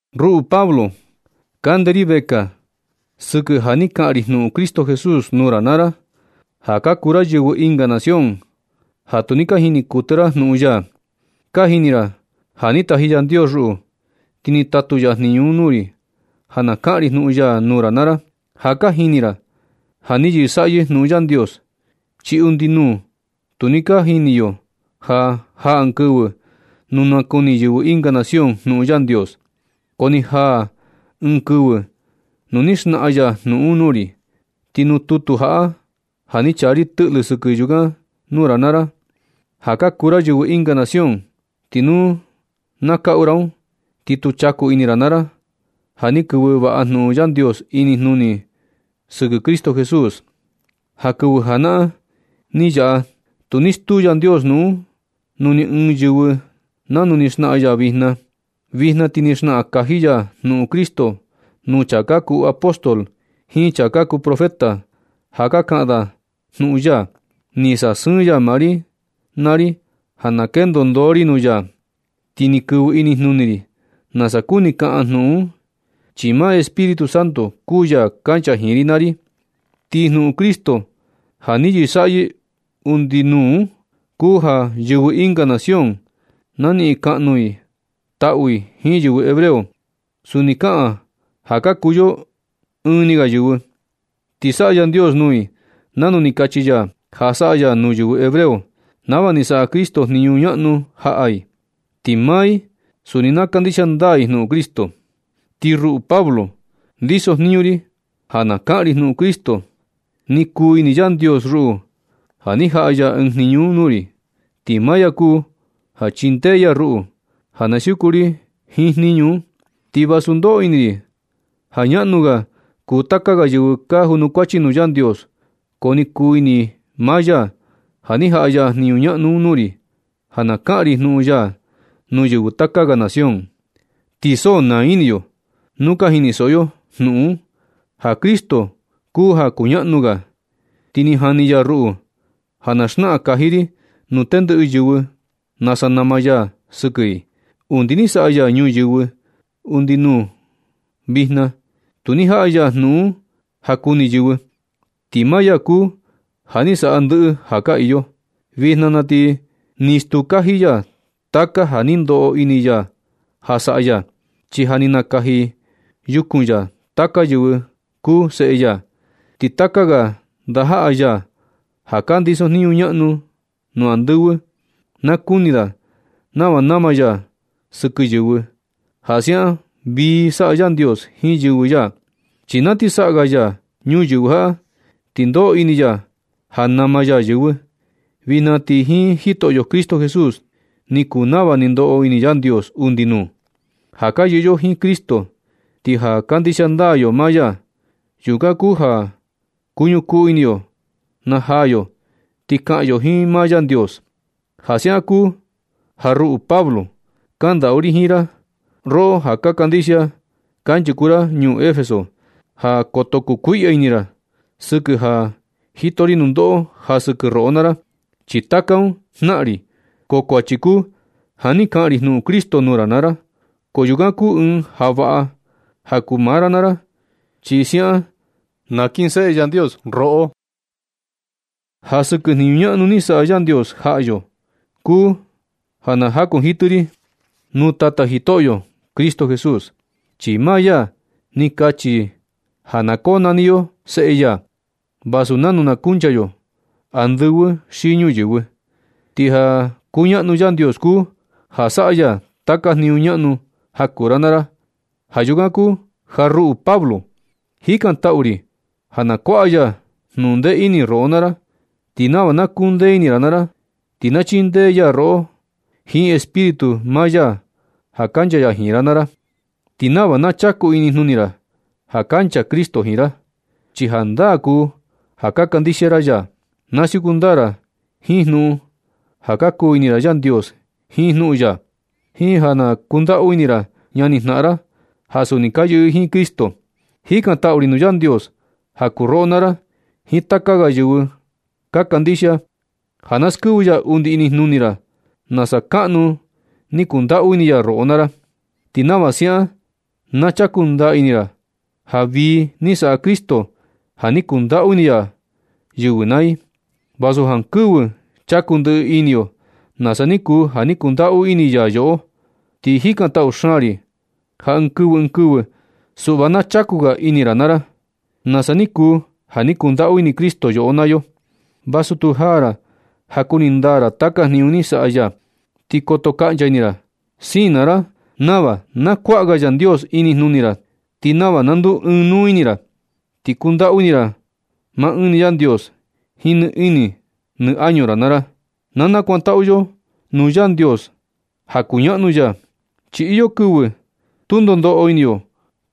Ruꞌu Pablo, kande ri vekaa sɨkɨ ja ni kaꞌan ri jnuꞌun Cristo Jesús nuu ra naa ra, ja ka kuu ra yɨvɨ ɨnga nación ja tu ni ka jini kuɨtɨ ra jnuꞌun ya. Ka jini ra ja ni taji Yandios ruꞌu, ti ni tatu ya jniñu un nuu ri ja na kaꞌan ri jnuꞌun ya nuu ra naa ra. Ja ka jini ra ja ni yɨsaꞌyɨ jnuꞌun Yandios, chi undi nuu tu ni ka jini yo ja jaa ɨɨn kɨvɨ nu nakuni yɨvɨ ɨnga nación jnuꞌun Yandios. Ko ni jaa ɨɨn kɨvɨ nu ni xnaꞌan ya jnuꞌun un nuu ri. Ti nuu tutu jaꞌa ja ni chaa ri tɨꞌlɨ sɨkɨ yukan nuu ra naa ra, ja ka kuu ra yɨvɨ ɨnga nación. Ti nu na kaꞌu ra un ti kuu chaku ini ra naa ra ja ni kɨvɨ vaꞌa jnuꞌun Yandios inijnuni ri sɨkɨ Cristo Jesús. Na kɨvɨ janaꞌan ni yaꞌa tu ni stuu Yandios jnuꞌun un nuu ni ɨɨn yɨvɨ nanu ni xnaꞌan ya vijna. Vijna ti ni xnaꞌan kaji ya jnuꞌun Cristo nuu chaa ka kuu apóstol jiin chaa ka kuu profeta ja ka kaꞌan da jnuꞌun ya. Ni sasɨɨn ya maa ri naa ri ja na kendo ndoo ri nuu ya, ti ni kɨvɨ inijnuni ri nasa kuni kaꞌan jnuꞌun un, chi maa Espíritu Santo kuu ya kancha jiin ri naa ri. Ti jnuꞌun Cristo ja ni yɨsaꞌyɨ undi nuu un, kuu ja yɨvɨ ɨnga nación na niꞌin kaꞌnu i taꞌu i jiin yɨvɨ hebreo. Suni kaꞌan ja ka kuu yo ɨɨn ni ga yɨvɨ. Ti saꞌa Yandios nuu i nanu ni kachi ya ja saꞌa ya nuu yɨvɨ hebreo nava ni saꞌa Cristo jniñu ñaꞌnu jaꞌa i. Ti maa i suni na kandixia ndaa i jnuꞌun Cristo. Ti ruꞌu Pablo, ndisojniñu ri ja na kaꞌan ri jnuꞌun Cristo. Ni kuu ini Yandios ruꞌu ja ni jaꞌa ya ɨɨn jniñu un nuu ri. Ti maa ya kuu ja chindee ya ruꞌu ja na siuku ri jiin jniñu un. Ti vasu ndoꞌo ini ri ja ñaꞌnu ga kuu taka ga yɨvɨ ka junukuachi nuu Yandios, ko ni kuu ini maa ya ja ni jaꞌa ya jniñu ñaꞌnu un nuu ri, ja na kaꞌan ri jnuꞌun ya nuu yɨvɨ taka ga nación. Ti so naa ini yo nu ka jinisoꞌo yo jnuꞌun un ja Cristo kuu ja kuñaꞌnu xaan ga. Ti ni jani ya ruꞌu ja na xnaꞌan kaji ri nuu tendɨꞌɨ yɨvɨ nasa nama ya sɨkɨ i. Undi ni saꞌa ya ñuyɨvɨ undi nuu vijna, tu ni jaꞌa ya jnuꞌun un ja kuni yɨvɨ, ti maa ya kuu ja ni saꞌa ndɨꞌɨ ja ka iyo. Vijna na ti ni stuu kaji ya taka ja ni ndoꞌo ini ya ja saꞌa ya, chi ja ni nakaji yukun ya taka yɨvɨ kuu seꞌe ya. Ti taka ga ndajaꞌa ya ja ka ndisojniñu ñaꞌnu nuu andɨvɨ, na kuni da nava nama ya sɨkɨ yɨvɨ, ja siaꞌan vii saꞌa Yandios jiin yɨvɨ ya. Chi na ti saꞌa ga ya ñuyɨvɨ jaꞌa, ni ndoꞌo ini ya ja nama ya yɨvɨ. Vijna ti jiin Jitoꞌo Cristo Jesús ni kuu nava ni ndoꞌo ini Yandios undi nuu. Ja ka yɨꞌɨ yo jiin Cristo ti ja kandixia ndaa yo maa ya, yukan kuu ja kuñukuu ni ini yo najaa yo ti kaꞌan yo jiin maa Yandios. Ja siaꞌan kuu ja ruꞌu Pablo, kandaꞌu ri jiin ra, roꞌo ja ka kandixia kanchuku ra ñuu Efeso, ja koto kukuiꞌya ini ra sɨkɨ ja jito ri nundoꞌo ja sɨkɨ roꞌo naa ra. Chi taka un jnaꞌan ri, ko kuachi kuu ja ni kaꞌan ri jnuꞌun Cristo nuu ra naa ra. Ko yukan kuu ɨɨn ja vaꞌa ja kuu maa ra naa ra, chi siaꞌan sa nakinseꞌe Yandios roꞌo. Ja sɨkɨ jniñu ñaꞌnu ni saꞌa Yandios jaꞌa yo, kuu ja na jakunjitɨ ri nuu Tata Jitoꞌo Cristo Jesús. Chi maa ya ni kachi ja na konani yo seꞌe ya, vasu nanu na kuncha yo andɨvɨ xi ñuyɨvɨ. Ti ja kuñaꞌnu Yandios kuu ja saꞌa ya taka jniñu ñaꞌnu ja kuu ra naa ra. Ja yukan kuu ja ruꞌu Pablo, jikantaꞌu ri ja na kuaꞌa ya jnuꞌun ndee ini roꞌo naa ra. Ti nava na kundee ini ra naa ra, ti na chindee ya roꞌo jiin Espíritu maa ya ja kancha ya jiin ra naa ra. Ti nava na chaku inijnuni ra ja kancha Cristo jiin ra, chi jandaa kuu ja ka kandixia ra ya. Na siuku ndaa ra jiin jnuꞌun ja ka kuu ini ra Yandios jiin jnuꞌun ya, jiin ja na kundaꞌu ini ra ñani jnaꞌan ra ja suni ka yɨꞌɨ jiin Cristo. Jikantaꞌu ri nuu Yandios ja kuu roꞌo naa ra jiin taka ga yɨvɨ ka kandixia, ja na skɨvɨ ya undi inijnuni ra nasa kaꞌnu ni kundaꞌu ini ya roꞌo naa ra. Ti nava siaꞌan na chaku ndaa ini ra ja vii ni saꞌa Cristo ja ni kundaꞌu ini ya yɨvɨ naa i, vasu jankɨvɨ chaku ndɨꞌɨ ini yo nasa ni kuu ja ni kundaꞌu ini ya yoꞌo. Ti jikantaꞌu xaan ri ja ɨɨn kɨvɨ ɨɨn kɨvɨ suꞌva na chaku ga ini ra naa ra, nasa ni kuu ja ni kundaꞌu ini Cristo yoꞌo naa yo, vasu tu jaa ra ja kuni ndaa ra taka jniñu ni saꞌa ya. Ti koto kaꞌncha ini ra. Siin naa ra nava na kuaꞌa ga Yandios inijnuni ra, ti nava na nduu ɨɨn nuu ini ra, ti kundaꞌu ini ra maa ɨɨn ni Yandios jiin nɨ ini nɨ añu ra naa ra. Na nakuantaꞌu yo nuu Yandios ja kuñaꞌnu ya, chi iyo kɨvɨ tu ndoo ndoꞌo ini yo,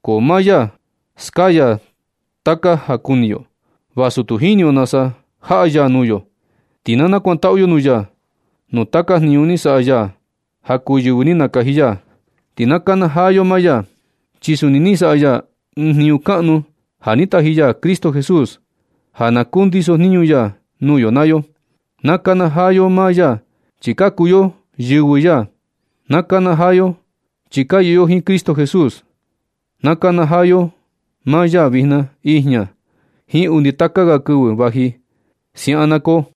ko maa ya skaya taka ja kuni yo, vasu tu jini yo nasa jaꞌa ya nuu yo. Ti na nakuantaꞌu yo nuu ya nuu taka jniñu ni saꞌa ya ja kuu yɨvɨ ni nakaji ya. Ti na nakanajaa yo maa ya, chi suni ni saꞌa ya ɨɨn jniñu kaꞌnu ja ni taji ya Cristo Jesús ja na kundisojniñu ya nuu yo naa yo. Na nakanajaa yo maa ya chi ka kuu yo yɨvɨ ya. Na nakanajaa yo chi ka yɨꞌɨ yo jiin Cristo Jesús. Na nakanajaa yo maa ya vijna, ijña, jiin undi taka ga kɨvɨ vaji. Siaꞌan na koo.